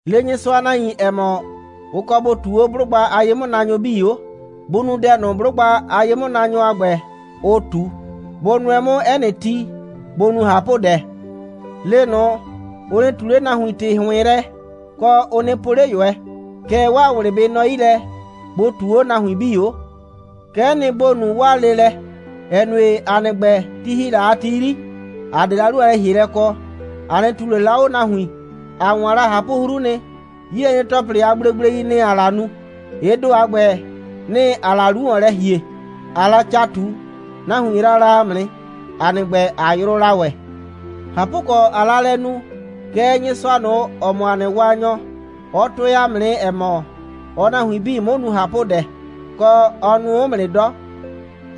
Le Nyɩsʋa a nahuin, ‑ɛ mɔ, ʋ kɔ bʋ ꞊tuu 'o 'blʋgba a ye'mʋnaanyʋ 'bii 'o. Bʋ nu dɛ ꞊nʋ, 'blʋgba a ye'mʋnaanyʋ a ‑gbɛ, ʋʋ ꞊tu. Bʋ nʋɛ 'mʋ 'ɛ nɩ ti, bʋ nu ꞊hapʋdɛ. Le ꞊nʋ, ʋ nɩ ꞊tu 'le nahuin ‑tɩ ‑hʋɩn yrɛ, kɔ, ʋ nɩ po 'le ꞊yʋɛ. Kɛɛ, 'waa ꞊wlɩ bɩ nɔ 'yi lɛ, bʋ ꞊tuu 'o nahuin 'bii 'o. Kɛ'ɛ nɩ, ‑bo nu 'waa leelɛ, ‑ɛ nue, ‑a nɩ ‑gbɛ, ti ‑hi la a ti 'yri, ‑a 'de la 'lu a lɛ‑hielɛ kɔ. ‑A 'nɩ ꞊tuu ꞊le la 'o nahuin. ‑A 'waan la ꞊hapʋ'hru nɩ. 'Yilɛnyre‑tɔplɩ a gblegblei, nɩ‑ ‑aa la nu. Ɩ ‑do a ‑gbɛ, nɩ‑ ‑aa la 'lu ‑wɔn lɛ ‑hie, ꞊aa la ca ꞊tu. Nahuin yraa la ‑a mʋ nɩ, ‑a nɩ ‑gbɛ, ꞊a yrʋʋ la ‑wɛ. ꞊Hapʋkɔ, ꞊aa la lɛ nu, kɛɛ, Nyɩsʋa ꞊nʋ, ‑ɔ mɔ ‑a nɩ Waanyɔ, ɔ tʋɛ ‑a mʋ nɩ, ‑ɛ mɔ, ɔɔ nahuin 'bii 'mʋ nu ꞊hapʋdɛ, kɔ, ɔ nʋʋ 'mʋ nɩ 'dɔ.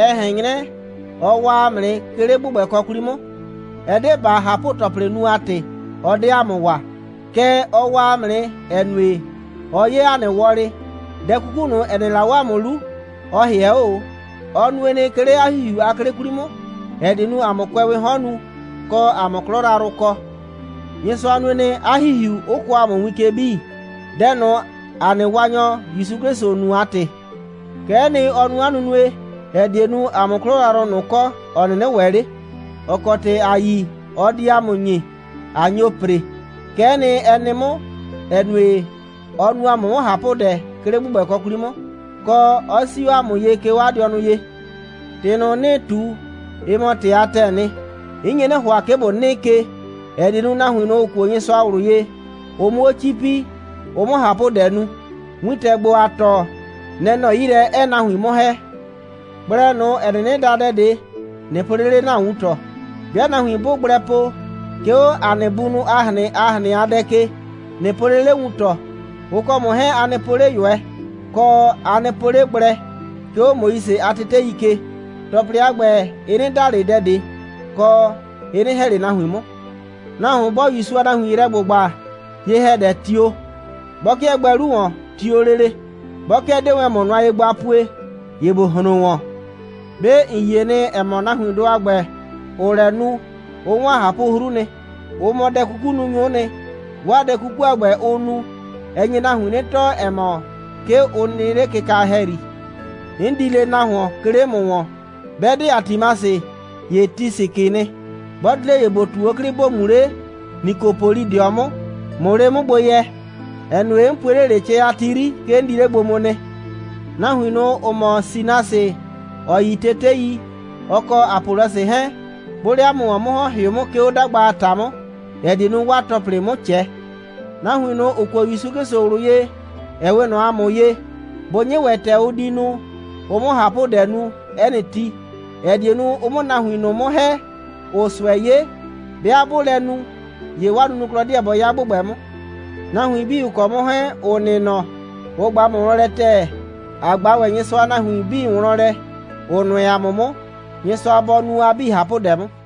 Ɛ ꞊hɛn 'nyrɛ, ɔ waa ‑a mʋ nɩ, 'ke 'le ‑gbʋgbɛkɔ 'kwli 'mʋ. Ɛ 'de ‑baa ꞊hapʋ‑tɔplɩ nu a ‑tɩ, ɔ 'de ‑a mʋ waa. Kɛɛ, ɔ waa ‑a mʋ nɩ, ‑ɛ nue, ɔ 'ye ‑a nɩ wɔlɩ. Dɛ 'kuku ꞊nʋ, ‑ɛ nɩ la 'o ‑a mʋ 'lu, ɔ ‑hɩɛ 'o ꞊o. Ɔ nue nɩ, 'ke 'le 'a ‑Hihiu a 'klɩ 'kwli 'mʋ, ‑ɛ die nu, ‑a 'mʋ kʋɛwɩɩ 'hɔn nu, kɔ, ‑a 'mʋ 'klɔ yrayrʋ kɔ. Nyɩsʋa nue nɩ, 'a ‑Hihiu 'ʋ kɔɔ ‑a mʋ win ke 'bii, dɛ ꞊nʋ, ‑a nɩ Waanyɔ ‑Yusu 'Klɩsʋ nu a ‑tɩ. Kɛ'ɛ nɩ, ɔ nu 'a nunue, ‑ɛ die nu, ‑a 'mʋ 'klɔ yrayrʋ ꞊nʋ kɔ, ‑ɔ 'nɩnɩ ‑wɛ 'le, ‑ɔ kɔ ‑tɩ ‑a yi, ɔ di ‑a mʋ ‑nyi, ꞊a nyo ‑pre. Kɛ'ɛ nɩ, ɛ nɩ 'mʋ, ‑ɛ nue, ɔ nu ‑a mʋ 'mʋ ꞊hapʋdɛ, 'ke 'le ‑gbʋgbɛkɔ 'kwli 'mʋ, kɔ, 'ɔ 'sii 'o ‑a mʋ ye, 'ke 'o 'a dɩɔnʋ ye. ‑Tɩ ꞊nʋ, 'nɩɩ ꞊tu, ɩ mɔ ‑tɩ a ‑tɛɛ nɩ. 'N nye 'nɩ ‑hʋa, 'ke ‑bo 'nɩɩ ke, ‑ɛ die nu, nahuin ꞊nʋ, ‑ʋ kuo Nyɩsʋa ꞊wlʋ ye, ʋ 'mʋ 'o 'cipi, ʋ 'mʋ ꞊hapʋdɛ nu. Wintɛ ‑gbo, ‑aa tɔɔ, nɛ‑ nɔ 'yi lɛ, 'ɛɛ nahuin 'mʋ ‑hɛ. Gblɛ ꞊nʋ, ‑ɛ 'nɩnɩ da dɛ ꞊de, ꞊nɩ po 'le 'le ‑na wuntɔ. 'Bɩa nahuin 'bʋʋ gblɛ po, 'ke 'o ‑a nɩ bunʋ a ꞊hrɩn a ꞊hrɩn a dɛ ke, ꞊nɩ po 'le 'le wuntɔ. Ʋ kɔ ‑mʋ 'hɛɛn, a nɩ po 'le ꞊yʋɛ. Kɔ, a nɩ po 'le gblɛ, 'ke 'o Moise a tetei ke. ‑Tɔplɩ a ‑gbɛ, ɩ 'nɩ da ꞊le dɛ ꞊de, kɔ, ɩ 'nɩ ‑hɛ ꞊le nahuin 'mʋ. Nahuon 'bɔɔ ‑Yusu a nahuin yrɛ ‑gbʋgba, ye‑hɛdɛ, tio. 'Bɔ 'kɩɛ gbɛɛ 'lu ‑wɔn, tio lele. 'Bɔ 'kɩɛ 'dee wɛn ‑mʋ nʋa ye gbo a pue, ‑ye ‑bo hron ‑wɔn. 'Be ‑n yie nɩ, ‑ɛ mɔ, nahuindʋ a ‑gbɛ, ‑ʋʋ lɛ nu, ʋ 'waan ꞊hapʋ'hru nɩ. Ʋ mɔ dɛ'kukununyʋ'ʋ nɩ. 'Waa dɛ 'kuku a ‑gbɛ, ʋʋ nu, ɛ nye nahuin 'nɩ tɔɔ, ‑ɛ mɔ, 'ke ʋ nɩ 'le kɩka ‑hɛyri. 'N di le nahuon, 'ke 'le ‑mʋ ‑wɔn. 'Bɛ 'de Atimasɩ, ‑ye Tisikɩɩ nɩ. 'Bɔ di 'le, ‑ye ‑bo ꞊tu 'o 'klɩ, ‑bo mu 'le Nikopolidɩɔ 'mʋ, ꞊mʋ 'le 'mʋ gbo yɛ, ‑ɛ nue, 'n pue 'le ꞊le, cɛ a ti 'yri, 'ke 'n di 'le gbo mu nɩ. Nahuin ꞊nʋ, ‑ʋ mɔ Sɩnasɩ, ‑ɔ yi tetei, ɔ kɔ Apɔlɔsɩ 'hɛɛn, 'bʋʋ 'le 'a mʋ ‑wɔn 'mʋ ‑hɔn, ‑hɩʋ 'mʋ, 'ke 'o 'dagba a ‑ta 'mʋ, ‑ɛ die nu, 'waa ‑tɔplɩ 'mʋ ꞊cɛ. Nahuin ꞊nʋ, ‑ʋ kuo ‑Yusu 'Klɩsʋ ꞊wlʋ ye, ‑ɛ 'we ꞊nɔ ‑a mʋ ye, bʋ 'nyɩ ‑wɛ ‑tɛ ʋ di nu, ʋ 'mʋ ꞊hapʋdɛ nu 'ɛ nɩ ti, ‑ɛ die nu, ʋ 'mʋ nahuin ꞊nʋ 'mʋ ‑hɛ, ‑ʋʋ ꞊sʋɛ 'ye. 'Bɩa 'bʋʋ lɛ nu, ‑ye 'waa nunuklɔ 'deɛ bɔ 'ya ‑gbʋgbɛ 'mʋ. Nahuin 'bii, ‑ʋ kɔ 'mʋ 'hɛɛn, ‑ʋ nɩ nɔ, ʋ ꞊gba ‑mʋ wlɔn lɛ ‑tɛɛ. ‑A ꞊gba ‑wɛ Nyɩsʋa a nahuin 'bii wlɔn lɛ, ‑ʋ nʋɛ ‑a mʋ 'mʋ. Nyɩsʋa bɔ nu a 'bii ꞊hapʋdɛ 'mʋ.